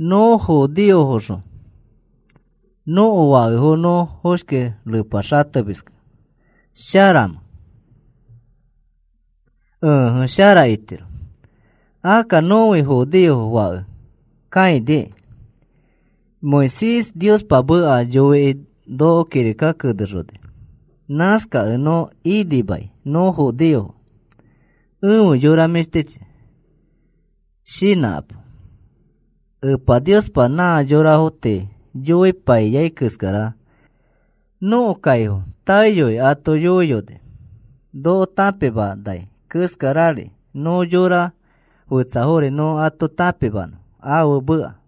¿Nõ judeofoxõ nõko fakefo nõ foshki repa xatemiskẽ sharamẽ? Ẽje, shara itiro. Akka nõfi judeofo fake kãiniki. Moisés Niospa meka yoikĩ noko kirika kenexoni. Nãskakẽ nõ inimai nõ judeofo. Efe yora mĩshtichi, shinãkapo. Epa Niospa nã yorafo tii yoipaiyai keskara nõko kaifo taeyoi ato yoiyoni. Noko tãpimanai keskarari nõ yora fetsafori nõ ato tãpimanõ ãfe meka.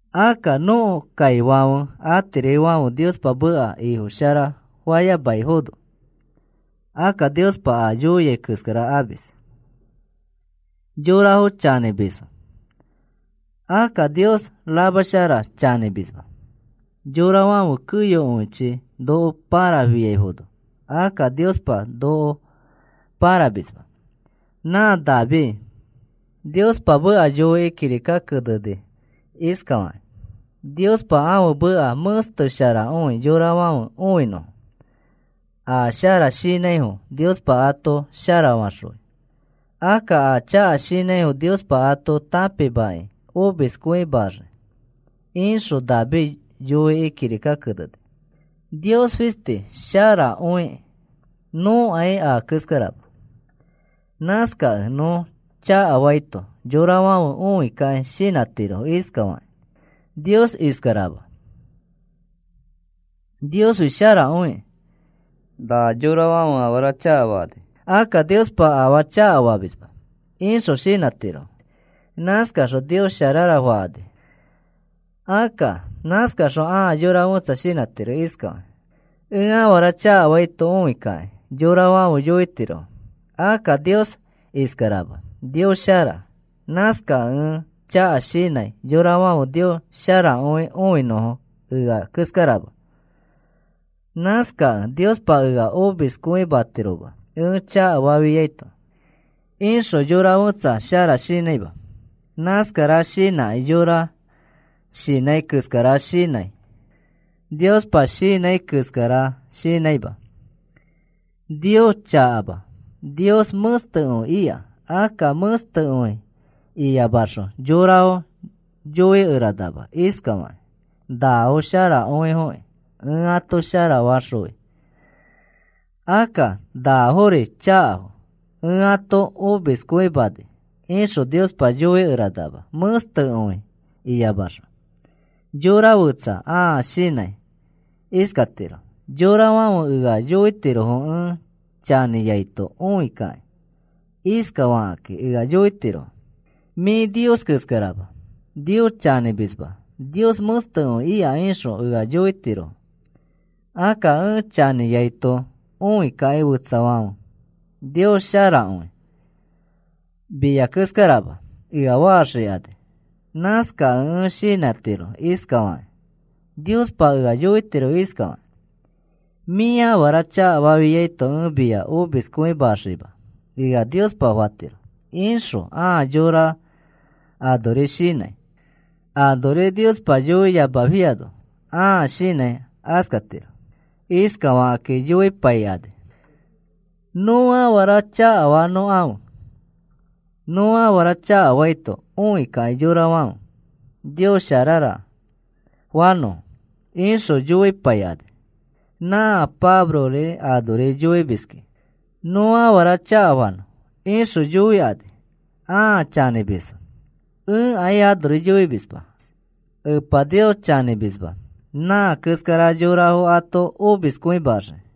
Akka nõko kaifãfe atirifãfe Niospa meka ifo shara fayamaifono akka Niospa a yoiai keskara amis. Yorafo chanĩmisfo. Akka Nios ramashara chanĩmisma. Yorafãfe keyokõichi noko pãrafiaifono akka Niospa noko pãramisma. Nã David Niospa meka yoikĩ kirika keneni iskafakĩ: Niospa ãfe meka mẽstesharakõi yorafãfe õinõfo. A shara shinãifo Niospa ato sharafaxõi. Akka a chaka shinãifo Niospa ato tãpimakĩ omiskõimaxii, ixõ David yoikĩ kirika keneni. Nios fistifi sharakõiki. Nõkai a keskarama. Nãskakẽ nõ chakafaito yorafãfe õikakĩ shinãtirofo iskafakakĩ: “Nios iskarama, Niosfi sharakõikĩ. Na yorafãfe afara chakafakani. Akka Niospa afaa chakafamisma,” ixõ shinãtirofo. Nãskaxõ Nios sharara fakani. Akka nãskaxõ ãa yora fẽtsa shinãtiro iskakĩ: “Ẽ afara chakafaito õikakĩ yorafãfe yoitirofo: ‘Akka Nios iskarama, Nios shara.’ Nãskakẽ ẽ chaka shinãi yorafãfe Nios sharakõi õinõfo ea keskarama. Nãskakẽ Niospa ea omiskõimatiroma ẽ chakafafiaito,” ixõ yora fẽtsa shara shinãima. Nãskara shinãkĩ yõra shinãi keskara shinãi, Niospa shinãi keskara shinãima. Nios chakama. Nios mẽstekõi ika. Akka mẽstekõi iyamaxõ yorafo yoikeranama iskafakĩ: “Nafo sharakõifoki. Ẽ ato sharafaxõi. Akka nafori chakafo. Ẽ ato omiskõimani,” ixõ Niospa yoikeranama mẽstekõi iyamaxõ. Yora fẽtsa ãa shinãi iskatiro: “Yorafãfe ea yoitirofo ẽ chanĩaito õikakĩ. Iskafakakĩ ea yoitirofo: ‘Mĩ Nios keskarama. Nios chanĩmisma. Nios mẽstekõi ika,’ ixõ ea yoitirofo. Akka ẽ chanĩaito õikakĩ fetsafãfe, ‘Nios sharakõi, mia keskarama,’ ea faxikani. Nãskakẽ ẽ shinãtiro iskafakĩ, Niospa ea yoitiro iskafakĩ: ‘Mĩ afara chakafafiaito ẽ mia omiskõimaxima,’ ea Niospa fatiro,” ixõ ãa yõra anori shinãi. Anori Niospa yoiyamafiano ãa shinãi askatiro. Iskafakakĩ yoipaikani: “Nõ afara chakafanõkãfe. Nõ afara chakafaito õikakĩ yorafãfe, ‘Nios sharara,’ fanõfo,” ixõ yoipaikani. “Nã Pablori anori yoimiski nõ afara chakafanõ,” ixõ yoikani. Ãa chanĩmisfo. Ẽkai anori yoimisma. Epa Nios chanĩmisma. Nã keskara yorafo ato omiskõimaxii.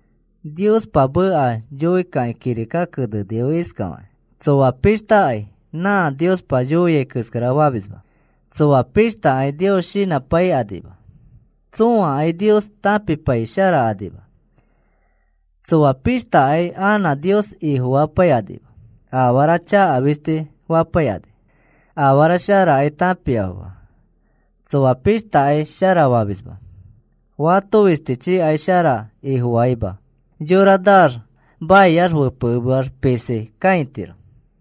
Niospa meka yoikakĩ kirika kenenifo iskafakakĩ: Tsoa pishtakai nã Niospa yoia keskara famisma. Tsoa pishtakai Nios shinãpaikanima. Tsõakai Nios tãpipaisharakanima. Tsoa pishtakai anã Nios Ifofapaikanima. Afara chaka fisti fapaikani. Afara sharakai tãpiafoma. Tsõa pishtakai sharafamisma. Fato fistichikai shara Ifofaima. Yora naax maiax fepekemeax pisi kãitiro.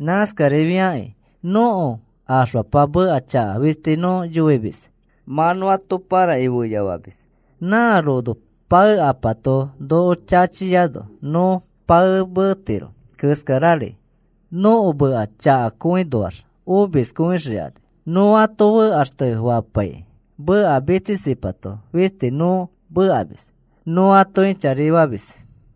Nãskarifiakĩ nõko axfapa meka chaka fisti nõ yoimis. Mã nõ ato pãrakĩ feyafamis. Nã rono paekapato noko chachiano nõ paemetiro keskarari nõko meka chakaõnoax omiskõixikani. Nõ ato fekaxtefapaikĩ meka mitsisipato fisti nõ mekamis. Nõ ato ĩchari famis.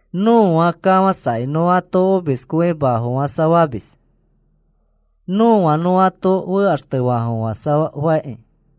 Nõa kafãsakĩ nõ ato omiskõimafofãsafamis. Nõa nõ ato fekaxtefaafofãsafaki.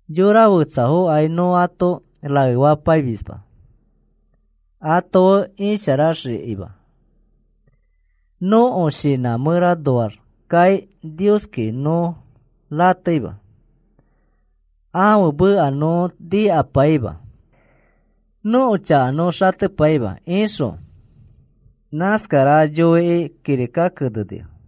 Yora fetsafokai nõ ato raefapaimisma ato fe isharaxikima. Nõko shinã mẽranoaxkai Nioski nõ rateima. Ãfe meka nõ nikapaima. Nõko chaka nõ xatepaima, ixõ nãskara yoikĩ kirika kenenifo.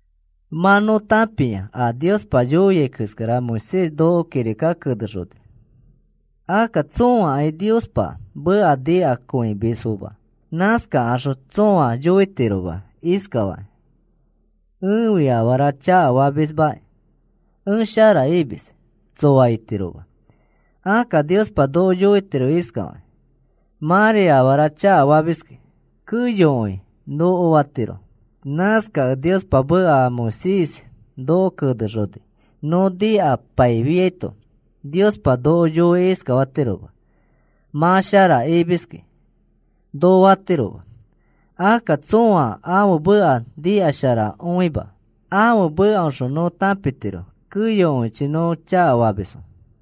Mã nõ tãpia a Niospa yoia keskara Moisés noko kirika kenexoni. Akka tsõakai Niospa meka nikakõimisfoma. Nãskaxõ tsõa yoitiroma iskakĩ: “Ẽfi afaa chakafamismaki. Ẽ shara imis,” tsoa itiroma. Akka Niospa noko yoitiro iskafakĩ: “Mãri afara chakafamiski,” keyokõi noko fatiro. Nãskakẽ Niospa meka a Moisés noko kenexoni nõ nikapaifiaito, Niospa noko yoikĩ iskafatiroma: “Mã shara imiski,” noko fatiroma. Akka tsõa ãfe meka nikasharakõima. Ãfe mekaoxõ nõ tãpitiro keyokõichi nõ chakafamisfo.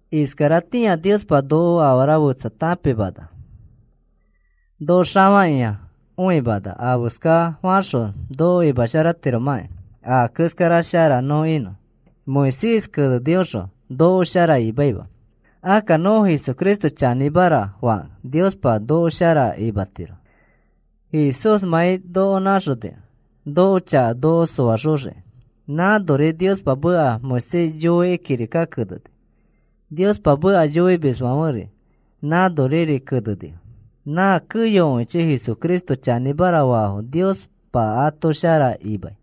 Iskaratĩa Niospa noko afara fetsa tãpimana. Noko xafakĩa õimana afeska faxõ noko imasharatiromãkĩ a keskara shara nõ inõ. Moisés kenenioxõ noko shara imaima. Akka nõ Jesucristo chanĩmara fakẽ Niospa noko shara imatiro Jesúsmãi noko nãxonikẽ nõko chaka noko soaxoxiki. Nãnori Niospa meka Moisés yoikĩ kirika keneni. Niospa meka yoimisfãferi nãnoriri kenenifo. Nã keyokõichi Jesucristo chanĩmara faifo Niospa ato shara imai.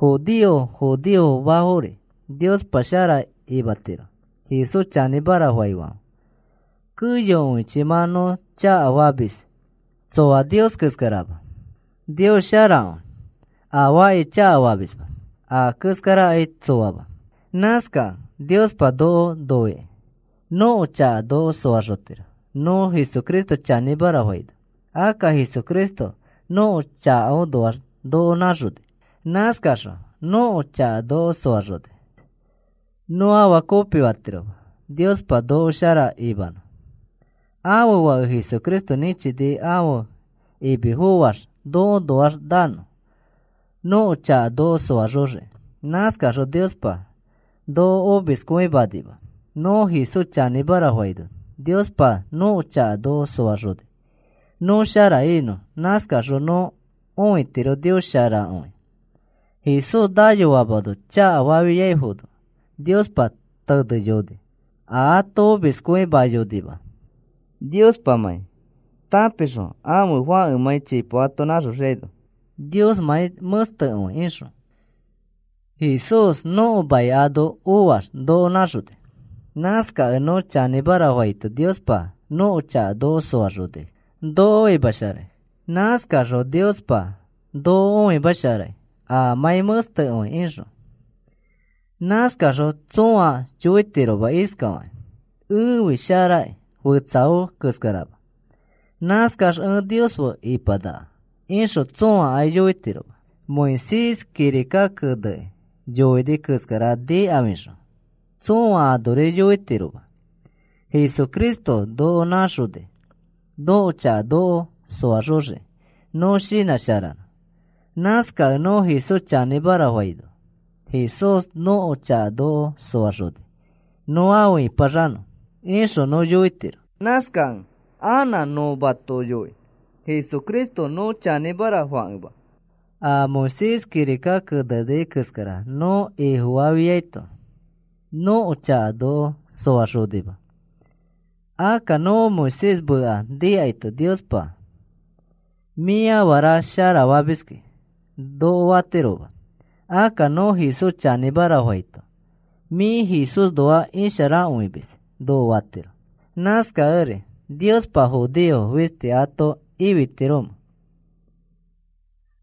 Judeofo, judeofomafori Niospa shara imatiro Jesús chanĩmara faifãfe. Keyokõichi mã nõ chakafamis. Tsoa Nios keskarama. Nios sharakõi. Afaakai chakafamisma. A keskarakai tsoama. Nãskakẽ Niospa noko noikĩ nõko chaka noko soaxotiro nõ Jesucristo chanĩmara faino. Akka Jesucristo nõko chakaõnoax noko nãxoni. Nãskaxõ nõko chaka noko soaxoni. Nõ afaa kopifatiroma Niospa noko shara imanõ. Ãfe Fake Jesucristo nĩchini ãfe imi foax nõõnoax nanõ nõko chaka noko soaxoxiki. Nãskaxõ Niospa noko omiskõimanima. Nõ Jesús chanĩmara faino Niospa nõko chaka noko soaxoni nõ shara inõ. Nãskaxõ nõ õitiro Nios sharakõi. Jesús nayoamano chakafafiaifono Niospa teneyoni. Ato omiskõimayonima Niospamãi tãpixõ ãfe Fãkemãi chipo ato nãxoxiaino Niosmãi mẽstekõi ixõ. Jesús nõko mai ano oax noko nãxoni. Nãskakẽ nõ chanĩmara faito Niospa nõko chaka noko soaxoni noko imasharai. Nãskaxõ Niospa noko õimasharai amãi mẽstekõi ixõ. Nãskaxõ tsõa yoitiroma iskafakĩ: “Ẽfi sharaki, fetsafo keskarama. Nãskax ẽ Nios fe ipanaka,” ixõ tsõakai yoitiroma. Moisés kirika kenekĩ yoini keskara nikafixõ tsõa anori yoitiroma. Jesucristo noko nãxoni nõko chaka noko soaxoxiki nõ shinãsharanõ. Nãskakẽ nõ Jesús chanĩmara faino, “Jesús nõko chaka noko soaxoni nõ afe ĩpaxanõ,” ixõ nõ yoitiro. Nãskakẽ anã nõ mato yoi. Jesucristo nõ chanĩmara fakẽma a Moisés kirika keneni keskara nõ ifofafiaito nõko chaka noko soaxonima. Akka nõ Moisés meka nikaito Niospa, “Mĩ afara sharafamiski,” noko fatiroma. Akka nõ Jesús chanĩmara faito, “Mĩ Jesúsnoax isharakõimis,” noko fatiro. Nãskakẽri, ¿Niospa judeofo fisti ato ifitiromẽ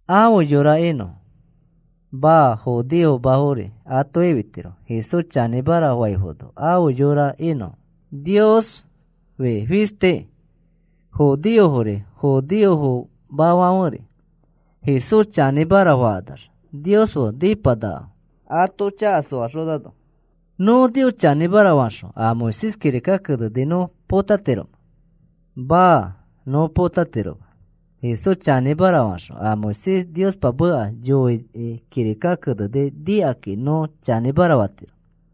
afe yora inõfo? Maa, judeofomafori ato ifitiro Jesús chanĩmara faifono afe yora inõfo. Niosfi fistiki. Judeofori, judeofomafãferi Jesús chanĩmara fakanax Nios fe nipanakafo ato chaka soaxonano. ¿Nõ Jesús chanĩmara faxõ a Moisés kirika keneni nõ potatiromẽ? Maa, nõ potatiroma. Jesús chanĩmara faxõ a Moisés Niospa meka yoikĩ kirika keneni nikakĩ nõ chanĩmara fatiro.